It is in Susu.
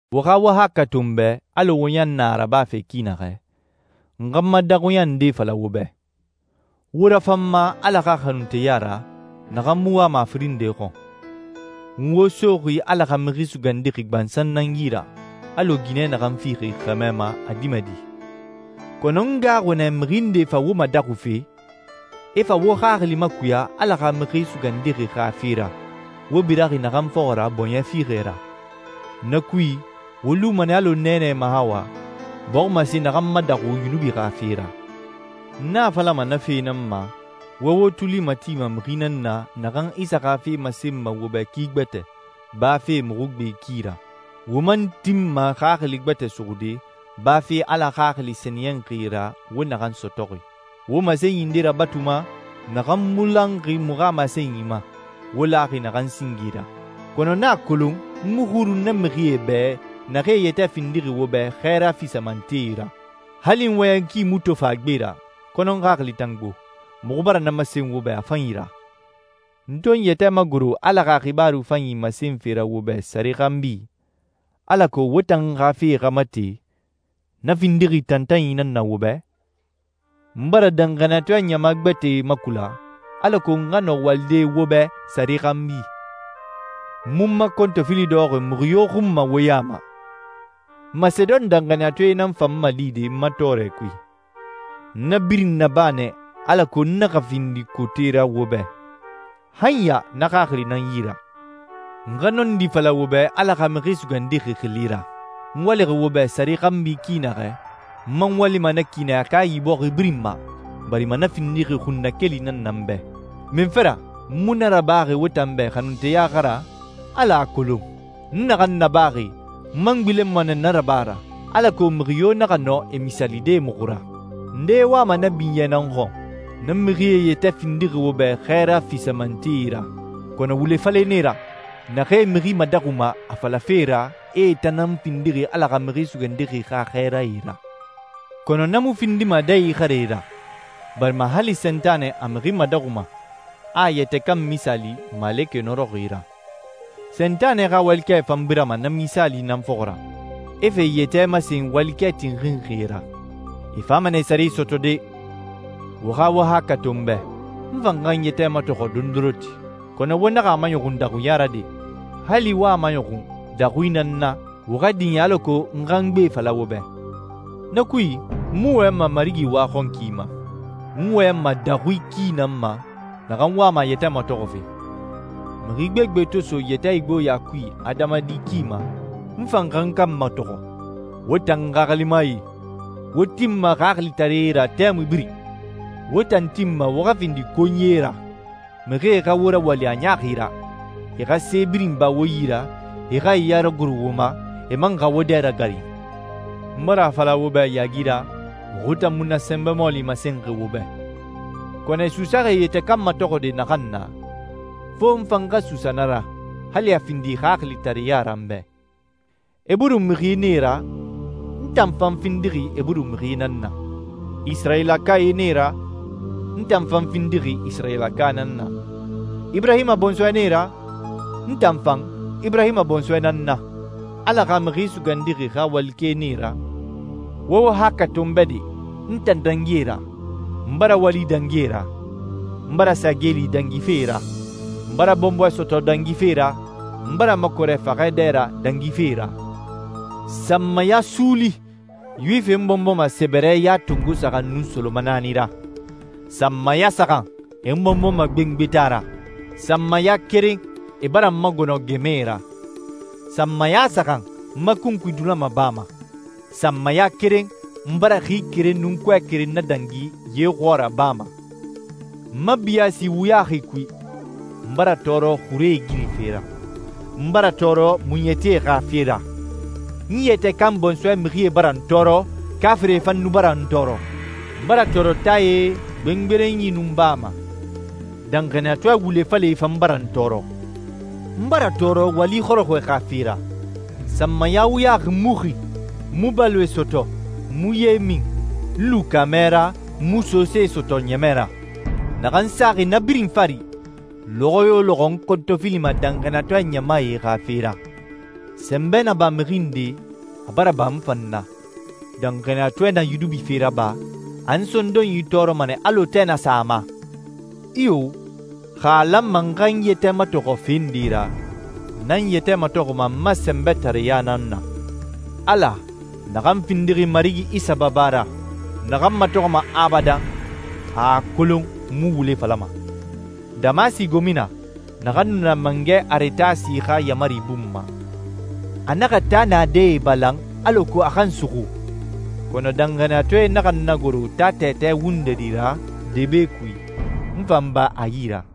Wo xa wo haakɛ to n bɛ, alɔ wo ɲan na a rabafe ki naxɛ, n xa n ma daxuɲa nde fala wo bɛ. Wo rafan n ma Ala xa xanunteya ra, naxan mu wama a firin nde xɔn. N wo soxi Ala xa Mixi Sugandixi gbansan nan yi ra, alɔ ginɛ naxan fixi xɛmɛ ma a dimɛdi. Kɔnɔ n gaaxuxi nɛ mixi ndee fa wo madaxufe, e fa wo xaxili makuya Ala xa Mixi Sugandixi xa fe ra, wo biraxi naxan fɔxɔ ra bɔɲɛ fiixɛ ra. Na kui, wo luma nɛ alɔ Nɛɛnɛ Mahawa bɔximase naxan madaxu yunubi xa fe ra. N a falama na fe nan ma, wo wo tuli matima mixi nan na, naxan Isa xa fe masenma wo bɛ ki gbɛtɛ, bafe muxu gbe ki ra. Wo man tinma xaxili gbɛtɛ suxude, bafe Ala Xaxili Sɛniyɛnxi ra wo naxan sɔtɔxi. Wo masenyi nde rabatuma naxan mu lanxi muxu xa masenyi ma, wo laxi naxan singe ra. Kɔnɔ n a kolon n mu xurun na mixie bɛ, naxee e yɛtɛ findixi wo bɛ xɛɛra fisamantee ra. Hali n wɔyɛn ki mu tofan a gbe ra, kɔnɔ n xaxili tan gbo. Muxu bara na masen wo bɛ a fanyi ra. N to n yɛtɛ magoro Ala xa xibaaru fanyi masenfe ra wo bɛ sare xanbi, alako wo tan xa fe xa mate, na findixi tantanyi nan na wo bɛ? N bara danxaniyatɔɛ ɲama gbɛtɛe makula, alako n xa nɔ walide wo bɛ sare xanbi. N mu n ma kɔntɔfili dɔxɔxi mixi yo xun ma wo ya ma. Masedon danxaniyatɔɛe nan fa n malide n ma tɔɔrɛ kui. N na birin naba nɛ alako n naxa findi kote ra wo bɛ. Han ya na xaxili na n yi ra. N xa nɔndi fala wo bɛ Ala xa Mixi Sugandixi xili ra, n walixi wo bɛ sare xanbi ki naxɛ, n man walima na ki nɛ Akayi bɔxi birin ma, barima na findixi xunnakeli nan na n bɛ. Munfe ra? N mu na rabaxi wo tan bɛ xanunteya xa ra? Ala a kolon. N naxan nabaxi, n man gbilenma nɛ na raba ra, alako mixi yo naxa nɔ e misaalide muxu ra. Ndee wama na binyɛ nan xɔn. Na mixie e yɛtɛ findixi wo bɛ xɛɛra fisamantee ra, kɔnɔ wule falɛe nan e ra, naxee mixi madaxuma, a falafe ra e tan nan findixi Ala xa Mixi Sugandixi xa xɛɛrae ra. Kɔnɔ na mu findima dɛ ixarɛ ra, barima hali Sentanɛ a mixi madaxuma, a a yɛtɛ kan misaali malekɛ nɔrɔxi ra. Sentanɛ xa walikɛe fan birama na misaali nan fɔxɔ ra, e fa e yɛtɛ masen walikɛ tinxinxie ra. E fama nɛ e sare sɔtɔde. Wo xa wo haakɛ to n bɛ, n fan xa n yɛtɛ matɔxɔ dondoronti, kɔnɔ wo naxa a maɲɔxun daxuɲa ra de! Hali wo a maɲɔxun daxui na n na, wo xa diɲɛ alako n xa n gbe fala wo bɛ. Na kui, n mu wɔyɛnma Marigi waxɔnki ma. N wɔyɛnma daxui ki nan ma naxan wama a yɛtɛ matɔxɔfe. Mixi gbegbe to so yɛtɛ igboɲa kui adamadi ki ma, n fan xa n kan matɔxɔ. Wo tan xaxilimae, wo tinma xaxilitaree ra tɛmui birin. Wo tan tinma wo xa findi konyie ra, mixie xa wo rawali a ɲaaxi ra, e xa se birin ba wo yi ra, e xa e ya ragoro wo ma, e man xa wo dɛ ragarin. N bara a fala wo bɛ yaagi ra, muxu tan mu na sɛnbɛ mɔɔli masenxi wo bɛ. Kɔnɔ e suusaxi e yɛtɛ kan matɔxɔɛ naxan na, fo n fan xa suusa na ra, hali a findi xaxilitareɲa ra n bɛ. Eburu mixie nan e ra? N tan fan findixi Eburu mixi nan na. Isirayilakae nan e ra? N tan fan findixi Isirayilaka nan na. Iburahima bɔnsɔɛ nan e ra? N tan fan Iburahima bɔnsɔɛ nan n na. Ala xa Mixi Sugandixi xa walikɛe nan e ra? Wo wo haakɛ to n bɛ de, n tan dangi e ra. N bara wali dangi e ra, n bara sa geeli dangife e ra, n bara bɔnbɔɛ sɔtɔ dangife e ra, n bara makɔrɛ faxɛ dɛ ra dangife e ra. Sanmaya suuli Yuwifie n bɔnbɔma sɛbɛrɛ ya tongo saxan nun solomanaani ra. Sanmaya saxan e n bɔnbɔma gbengbeta ra. Sanmaya keren e bara n magɔnɔ gɛmɛe ra. Sanmaya saxan n ma kunkui dulama baa ma. Sanmaya keren n bara xi keren nun kɔɛ keren nadangi ye xɔɔra baa ma. N ma biyaasi wuyaxi kui, n bara tɔɔrɔ xure igirife ra, n bara tɔɔrɔ muɲɛtie xa fe ra, n yɛtɛ kan bɔnsɔɛ mixie bara n tɔɔrɔ, kaafirie fan nu bara n tɔɔrɔ. N bara tɔɔrɔ taae, gbengberenyi, nun baa ma. Danxaniyatɔɛ wule falɛe fan bara n tɔɔrɔ. N bara tɔɔrɔ wali xɔrɔxɔɛe xa fe ra. Sanmaya wuyaxi n mu xi, n mu baloe sɔtɔ, n mu ye min, n lu kaamɛ ra, n mu sose sɔtɔ ɲɛmɛ ra. Naxan saxi na birin fari, lɔxɔ yo lɔxɔ n kɔntɔfilima danxaniyatɔɛ ɲamae xa fe ra. Sɛnbɛ na ba mixi nde, a bara ba n fan na. Danxaniyatɔɛ na yunubi fe raba, a n sondonyi tɔɔrɔma nɛ alɔ tɛ na sa a ma. Iyo, xa a lanma n xa n yɛtɛ matɔxɔ fe nde ra, n nan n yɛtɛ matɔxɔma n ma sɛnbɛtareya nan na. Ala, naxan findixi Marigi Isa baba ra, naxan matɔxɔma abadan, a a kolon n mu wule falama. Damasi gomina, naxan nu na Mangɛ Aretasi xa yaamari bun ma, a naxa taa naadɛe balan alako a xa n suxu, kɔnɔ danxaniyatɔɛe naxa n nagoro taa tɛtɛ wundɛri ra debe kui, n fa n ba a yi ra.